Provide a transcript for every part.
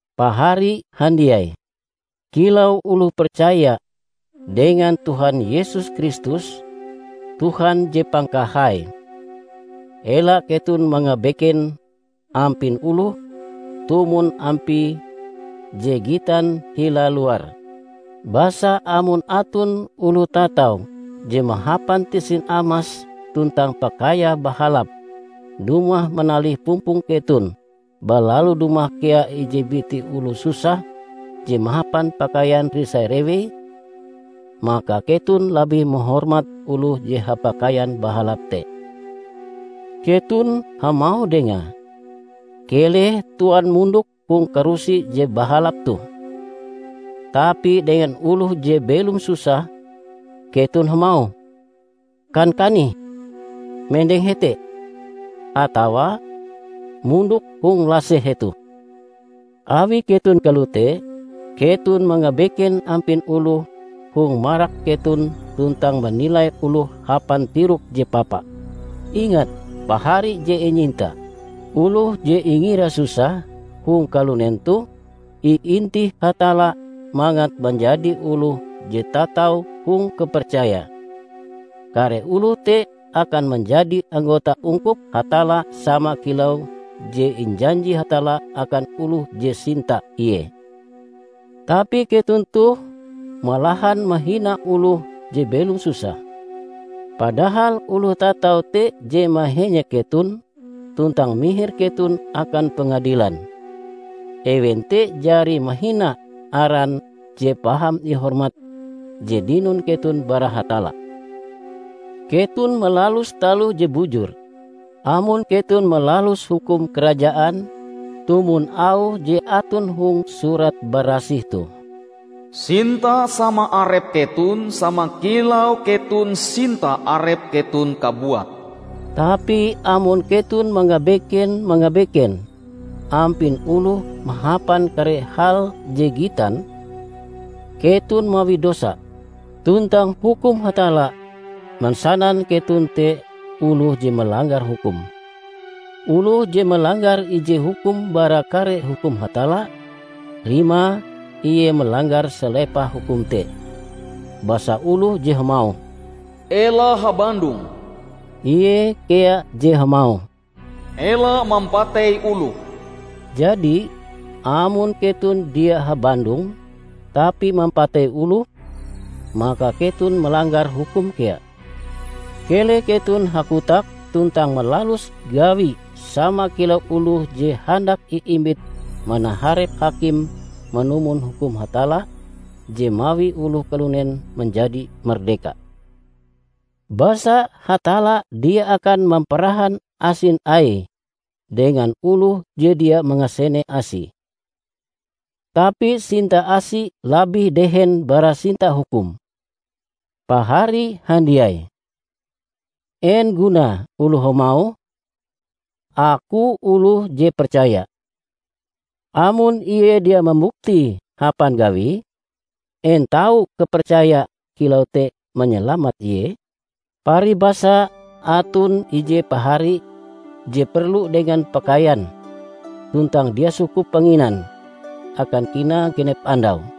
Pahari handiai! Kilau oloh percaya dengan Tuhan Yesus Kristus, Tuhan Je Pangkahai, ela keton mangabeken ampin oloh tumon ampie je gitan hila luar. Basa amon aton oloh tatau je mahapan tisin amas tuntang pakaiae bahalap dumah manalih pumpong keton balalu dumah kea ije biti oloh susah je mahapan pakaian risai-rewei, maka keton labih mahormat oloh je hapakaian bahalap te. Keton hamauh dengae, "Keleh Tuan mondok hong karusi je bahalap toh." Tapi dengan oloh je belom susah keton hamauh, "Kan kanih, mendeng hete," atawa "Mondok hong laseh hetoh." Awi keton kalote, keton mangabeken ampin oloh hong marak keton tuntang manilai oloh hapan tirok je papa. Ingat, pahari je inyinta! Oloh je ingira susah hong kalunen toh, iintih Hatalla mangat manjadi oloh je tatau hong kapercaya. Kare oloh te akan manjadi anggota ungkup Hatalla sama kilau je injanji Hatalla akan oloh je sinta Ie. Tapi keton toh malahan mahina oloh je belom susah, padahal oloh tatau te je mahenyek keton tuntang mihir keton akan pengadilan! Ewen te jari mahina aran je paham ihormat je dinon keton bara Hatalla! Keton malalus taloh je bujur, amon keton malalus hukum Karajaan tumon auh je aton hong Surat Barasih toh, "Sinta sama arep keton sama kilau keton sinta arep keton kabuat." Tapi amon keton mangabeken-mangabeken ampin oloh mahapan kare hal je gitan, keton mawi dosa, tuntang hukum Hatalla mansanan keton te oloh je malanggar hukum. Oloh je malanggar ije hukum bara kare hukum Hatalla, rimae ie malanggar salepah hukum te. Basa oloh je hamauh, "Ela habandong," ie kea je hamauh, "Ela mampatei oloh." Jadi, amon keton dia habandong, tapi mampatei oloh, maka keton malanggar hukum kea. Keleh keton hakotak tuntang malalus gawi sama kilau oloh je handak iimbit manaharep hakim manumon hukum Hatalla je mawi oloh kalunen manjadi mardeka. Basa Hatalla dia akan mamparahan asin Aie dengan oloh je dia mangasene asi. Tapi sinta asi labih dehen bara sinta hukum! Pahari handiai! En gunae oloh hamauh, "Aku oloh je percaya", amon ie dia mambuktie hapan gawie? En tau kapercaya kilau te manyalamat ie? Paribasa aton ije pahari je perlu dengan pakaian tuntang dia sukup panginan akan kinae genep andau.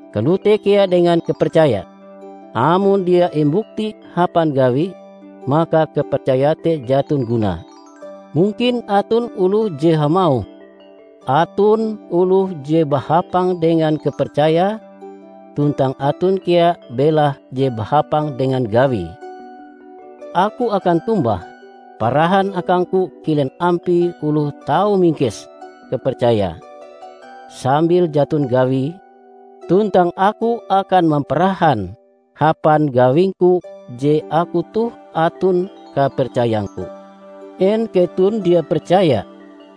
Kalote kea dengan kapercaya, amon dia imbukti hapan gawi, maka kapercaya te jaton gunae. Mungkin aton oloh je hamauh, "Aton oloh je bahapang dengan kapercayae tuntang aton kea belahe je bahapang dengan gawie." Aku akan tombah, "Parahan akangku kilen ampie oloh tau mingkes kapercaya sambil jaton gawie tuntang aku akan mamparahan hapan gawingku je aku toh aton kapercayangku." En keton dia percaya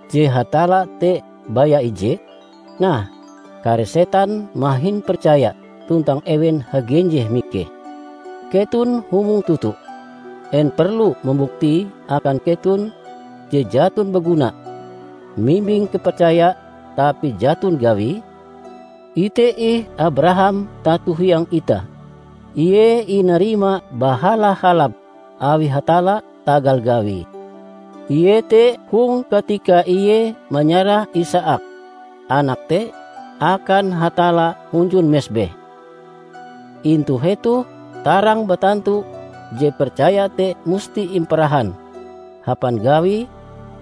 je Hatalla te baya ije? Nah, kare setan mahin percaya tuntang ewen hagenjeh mikeh! Keton humong toto! En perlu mambuktie akan keton je jaton baguna mimbing kapercaya tapi jaton gawie? Ite ih Abraham tato hiang itah. Ie inarima bahala-halap awi Hatalla tagal gawie, iete hong katika ie manyarah Isaak, anake te, akan Hatalla hunjun mesbeh. Intu hetoh tarang batantu je percaya te musti imparahan hapan gawi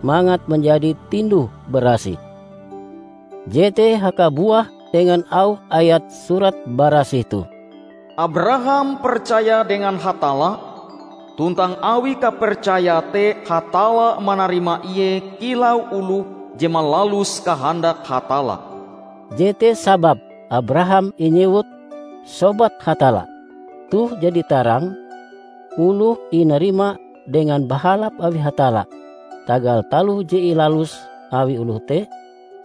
mangat manjadi tinduh-barasih. Jete hakabuah dengan auh ayat Surat Barasih toh, "Abraham percaya dengan Hatalla, tuntang awi kapercayae te Hatalla manarima ie kilau oloh je malalus kahandak Hatalla." Jete sababe Abraham inyewut, "Sobat Hatalla". Toh jadi tarang, oloh inarima dengan bahalap awi Hatalla tagal taloh je ilalus awi oloh te,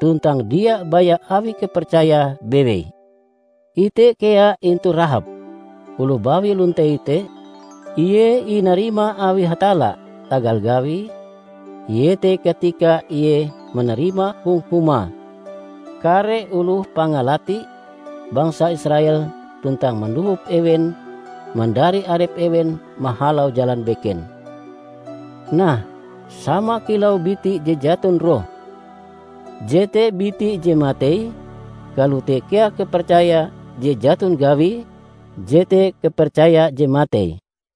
tuntang dia baya awi kapercayae bewei. Ite kea intu Rahab, oloh bawi lontei te. Ie inarima awi Hatalla tagal gawie, iete katika ie manarima hong humae kare oloh pangalati bangsa Israel tuntang mandohop ewen mandari arep ewen mahalau jalan beken. Nah, sama kilau biti je jaton roh, jete biti je matei, kalote kea kapercaya je jaton gawie, jete kapercaya je matei.